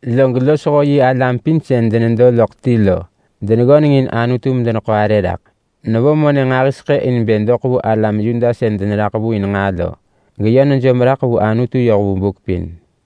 Log losho yi alam pin sën denedo loḳ ti lo deneggöneng in Anutu medeneḳo arë raḳ. Nevo monë nġahiseḳë in bë doḳ vu alam Yuda sën deneraḳ vu in nġaa lo, geyö nejom raḳ vu Anutu yoh vu buk pin.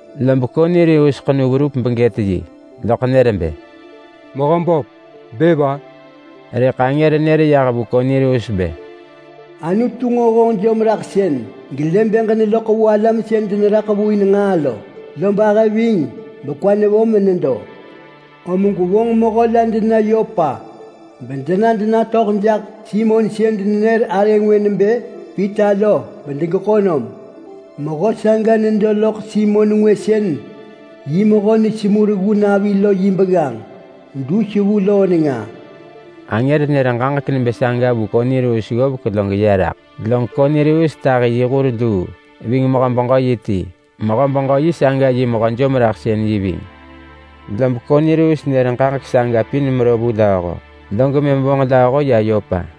Lob Kornelius ḳenu verup begët yi, loḳ nër bë, “Mehöböp! Bë va?” Rëḳ angër nër yah vu Kornelius bë, “Anutu lë honġ jomraḳsën gelë bë ġeneloḳ vu alam sën deneraḳ vu in nġaa lo, log lë bë yoh vu, lob kwa nevo menedo. Om gwevonġ mehö la dena Yopa bena denatöḳ jaḳ Simon sën denenër arë ngwë nebë Pita lo bedegeḳo nom. Mehö saga nedo loḳ Simon ngwë sën yi mehö nesemu reggu navi lo yi begganġ, dus vu loo nenga.” Angër nër ġaġek nebë saga vu Kornelius ggovek log ya raḳ, log Kornelius tahi yi hur luu ving mehö-beġö-yi ti. Mehö-beġö-yi saga yi mehö-jomraḳsën-yi ving. Lob Kornelius nër ġaġek saga pin mero vu lööho, log mëm vonġ lööho ya Yopa.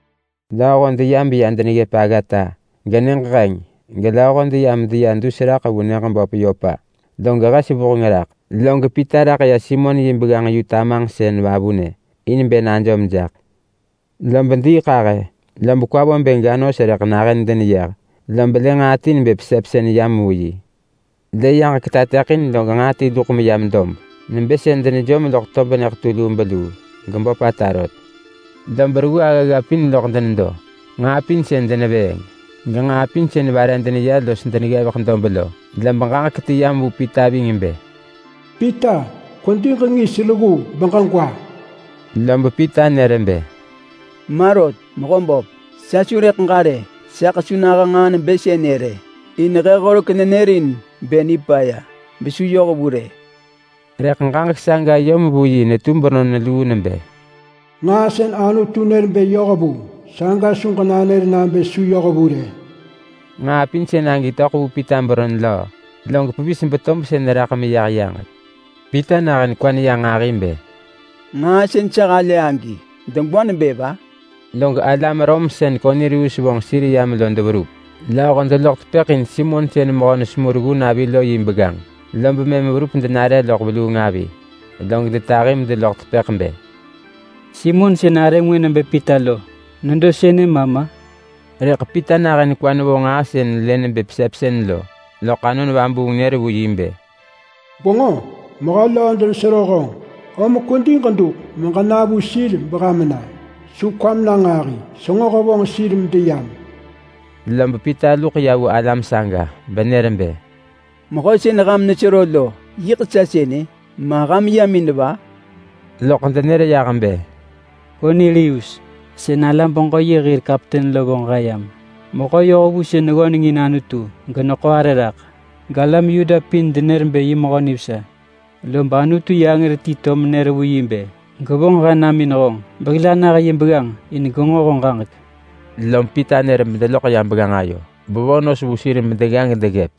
Lööho deya beya deneggëp aggata. Genyëġ heng gelööho deya medeya dus raḳ vu nyëġ böp Yopa log hes vuheng raḳ. Log Pita raḳ ya Simon yi begganġ yu-tamanġsën vavunë in bë najom jaḳ. Lob diiḳahë, lob kwa vo bë ga nos rëḳ nahën deneyeh, lob lë nġaa ti nebë pesepsën yam vu yi. Lë yaġek tateḳin log nġaa ti luḳ meyam dob nebë sën denejom loḳ tob nyëḳetu lubeluu lo, geböpata rot. Lob reggu aggagga pin loḳ nedo. Nġaa pin sën denevëëng, genġaa pin sën vare deneya los deneggevek dob lo. Lob ġaġek ti yam vu Pita ving bë, “Pita, kwedi ġengis reggu beġegwa!” Lob Pita nër bë, “Ma rot, Mehöböp! Sa su rëḳ ġa rë! Saḳ su naha nġaa nebë sënë rë. In he horek nenërin bë nipaya besu yohvu rë.” Rëḳ ġaġek saga yom vu yi netu beron luu nebë, “Nġaa sën Anutu nër bë yohvu, saga su ġenanër nabë su yohvu rë!” Nġaa pin sën agi töḳ vu Pita beron löö, log pevis betob sën yah meya vavunë. Pita nahën kwa neya nġahi bë, “Nġaa sën sa halë agi degwa nebë va?” log alam Rom sën Kornelius vonġ sir yam lo deverup. Lööho deloḳ tepëḳ in Simon sën mehö nesemu reggu navi lo yi begganġ, lob mëm verup denare loḳ veluung avi. Log detahi medeloḳ tepëḳ bë, “Simon sën arë ngwë nebë Pita lo nedo sënë ma ma?” Rëḳ Pita nahën kwa nevo nġaa sën lë nebë pesepsën lo, loḳ Anon Vabuung nër vu yi bë, “Gwenġo? Mehö löö denesero honġ! Om kwedi ġeduḳ meġena vu sir beham na. Su kwam na nġahi. Senġo hevonġ sir medeyam.” Lob Pita luḳ ya vu alam saga benër bë, “Mehö sën ham nesero lo, yiḳ sa sënë. Ma ham yam in-a?” Loḳ denër bë, “Kornelius, sën alam-beġö-yi hir kapten lo vonġ he yam. Mehö yohvu sën neggöneng in Anutu geneḳo arë raḳ, galam Yuda pin denër bë yi mehö nivesa. Lob Anutu yi angër ti to menër vu yi bë gevonġ he nam in honġ behil anah yi begganġ in bë genġo honġ ġaġek.” Lom Pita nër bedeloḳ ya begganġ ayo, bevo nos vu sir medegga gedeggëp.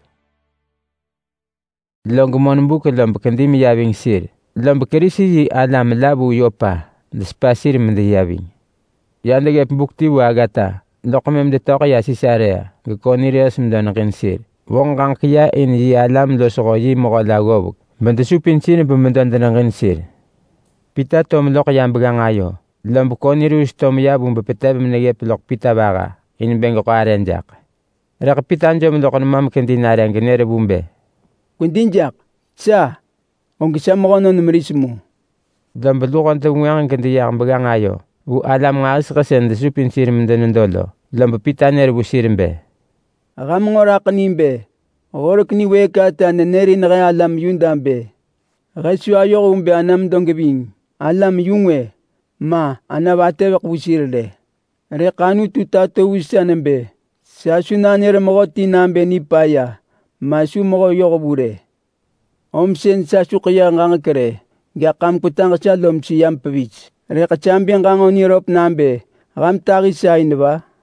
Log monbuk lob kedi meya ving sir, lob Kerisi-yi-alam la vu Yopa desepa sir medeya ving. Ya deggëp buk ti vu aggata, loḳ mëm detöḳ ya Sisarea geKornelius medo neġin sir. Tahi yi alam losho yi mehö la ggovek bedesupin sir benedo deneġin sir. Pita to meloḳ ya begganġ ayo, lob Kornelius to meya vu bepetev meneggëp loḳ Pita vaha in bë geḳo arë jaḳ. Rëḳ Pita jom loḳ nema mekedi nare genër vu bë, “Kwedi jaḳ! Sa, og sa mehönon meris mu!” Lob luho devengwënġ gedeyah begganġ ayo vu alam nġahiseḳë sën desupin sir medenedo lo. Lob Pita nër vu sir bë, “Ham nġo raḳ ni bë horek niwëëk ata nërin he alam Yuda bë he su ayoh vu bë ana medo geving alam-yu-ngwë, ma ana vatëveḳ vu sir rë. Rëḳ Anutu tato vu sa nebë sa su nanër mehöti nabë nipaya ma su mehö yohvu rë. Om sën sa su ḳeyëh ġaġek rë. Gaḳ ham kwetaġ sa lom seyam pevis. Rëḳ sa bë ġanġo niröp nabë ham tahi sa in va?”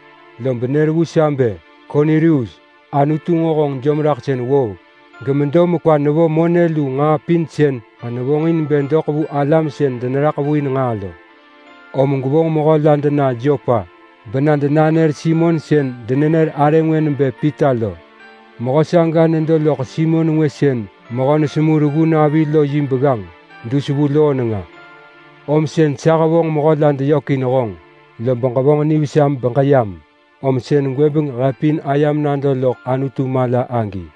Lob nër vu sa bë, ‘Kornelius, Anutu nġo honġ jomraḳsën ggovek gemedo mekwa nevo monë lu nġaa pin sën ġenevonġ in bë doḳ vu alam sën deneraḳ vu in nġaa lo. Om gwevonġ mehö la dena Yopa bena denanër Simon sën denenër arë ngwë nebë Pita lo. Mehö saga nedo loḳ Simon ngwë sën mehö nesemu reggu navi lo yi begganġ dus vu loo nenga.’ Om sën sa hevonġ mehö la deyök in honġ. Lob ġevonġ nivesa beġeyam, om sën gwëbeng he pin ayam nado loḳ Anutu mala agi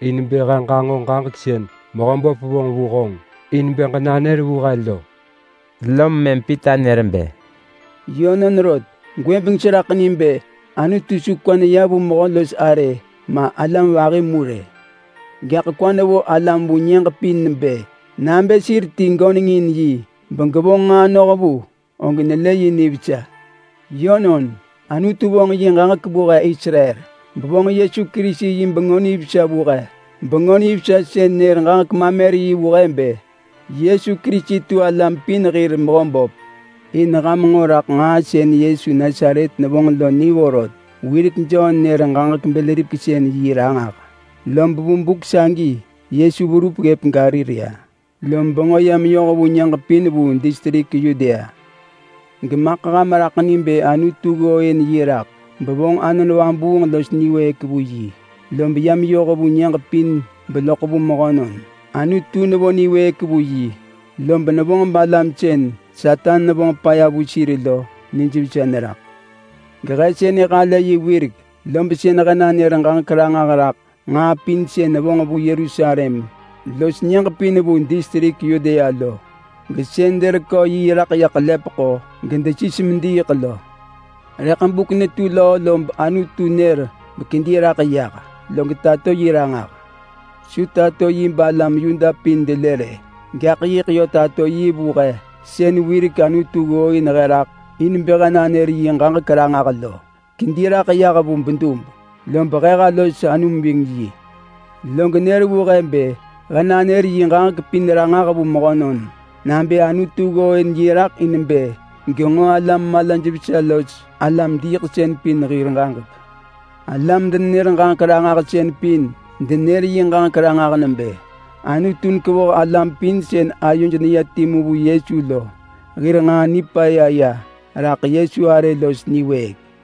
in bë he ġanġo ġaġek sën Mehöböp vonġ vu honġ in bë ġenanër vu he lo.” Lom mëm Pita nër bë, “Yönon rot, gwëbeng seraḳ ni bë Anutu su kwa ya vu mehö los arë ma alam vahi mu rë. Gaḳ kwa nevo alam vu nyëġ pin bë: Nabë sir ti göneng in yi begevonġ nġaa nohvu, og nelë yi nivesa. Yönon, Anutu vonġ yi ġaġek vu he Israel, bevonġ Yesu Kerisi yi Bengö Nivesa vu he. Bengö Nivesa sën nër ġaġek mamer vu he bë Yesu Kerisi tu alam pin hir Mehöböp. In ham nġo raḳ nġaa sën Yesu Nasaret nevonġ lo ni vorot. Wirek Jon nër ġaġek bël-ripeksën-yi ranġah, lob vu buk sagi Yesu verup ggëp Galilea, lob bengö ya meyoh vu nyëġ pin vu distrik Yudea. Gemaḳ ham raḳ ni bë Anutu ggooin yi raḳ bevonġ Anon Vabuung los niwëëk vu yi, lob ya meyoh vu nyëġ pin beloḳ vu mehönon. Anutu nevo niwëëk vu yi, lob vonġ alam sën Satan nevonġ paya vu sir lo benijvesa neraḳ. Gehe sënë halë yi wirek, lob sën he nanër ġaġek ranġah raḳ nġaa pin sën nevonġ vu Yerusalem los nyëġ pin vu distrik Yudea lo. Gesën derekö yi raḳ ḳelepeḳo gedesis mediiḳ lo. Rëḳ buk netu löö lob Anutu nër bekedi raḳ yah, log tato yi ranġah. Su tato yi balam Yuda pin delë rë. Gaḳ yiḳ yö tato yi vu he sën wirek Anutu ggooin he raḳ in bë he nanër yi ġaġek ranġah lo. Kedi raḳ yah vu bedub, lob he ha los anum ving yi. Log nër vu he bë he nanër yi ġaġek pin ranġah vu mehönon nabë Anutu ggooin yi raḳ in bë genġo alam-malaj-vesa los alam-diiḳsën pin hir ġaġek. Alam-denenër-ġaġek-ranġahsën pin denër yi ġaġek ranġah nebë: Anutu nekevoh alam pin sën ayoj neya timu vu Yesu lo hir nġaa nipaya ya raḳ Yesu arë los niwëëk.”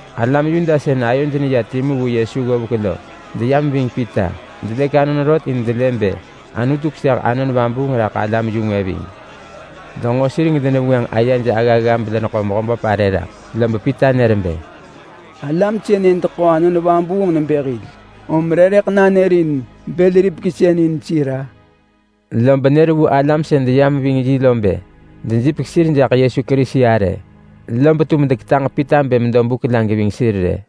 Alam Yuda sën ayoj neya timu vu Yesu wirek gedeyam ving Pita lo, delëk anon rot in denelë bë Anutu keseh Anon Vabuung raḳ alam-yu-ngwë ving. Denġo sir gedenenër ayej aggagga bedeneḳo Mehöböp arë raḳ, lob Pita nër bë, “Alam sënë deḳo Anon Vabuung nebë hil, om re rëḳ nanërin bël-ripeksën-yi in sir-a?” Lob nër vu alam sën deyam ving yi lo bë dejipek sir jaḳ Yesu Kerisi arë. Lob tum deketaġ vu Pita bë medo buk la geving sir rë.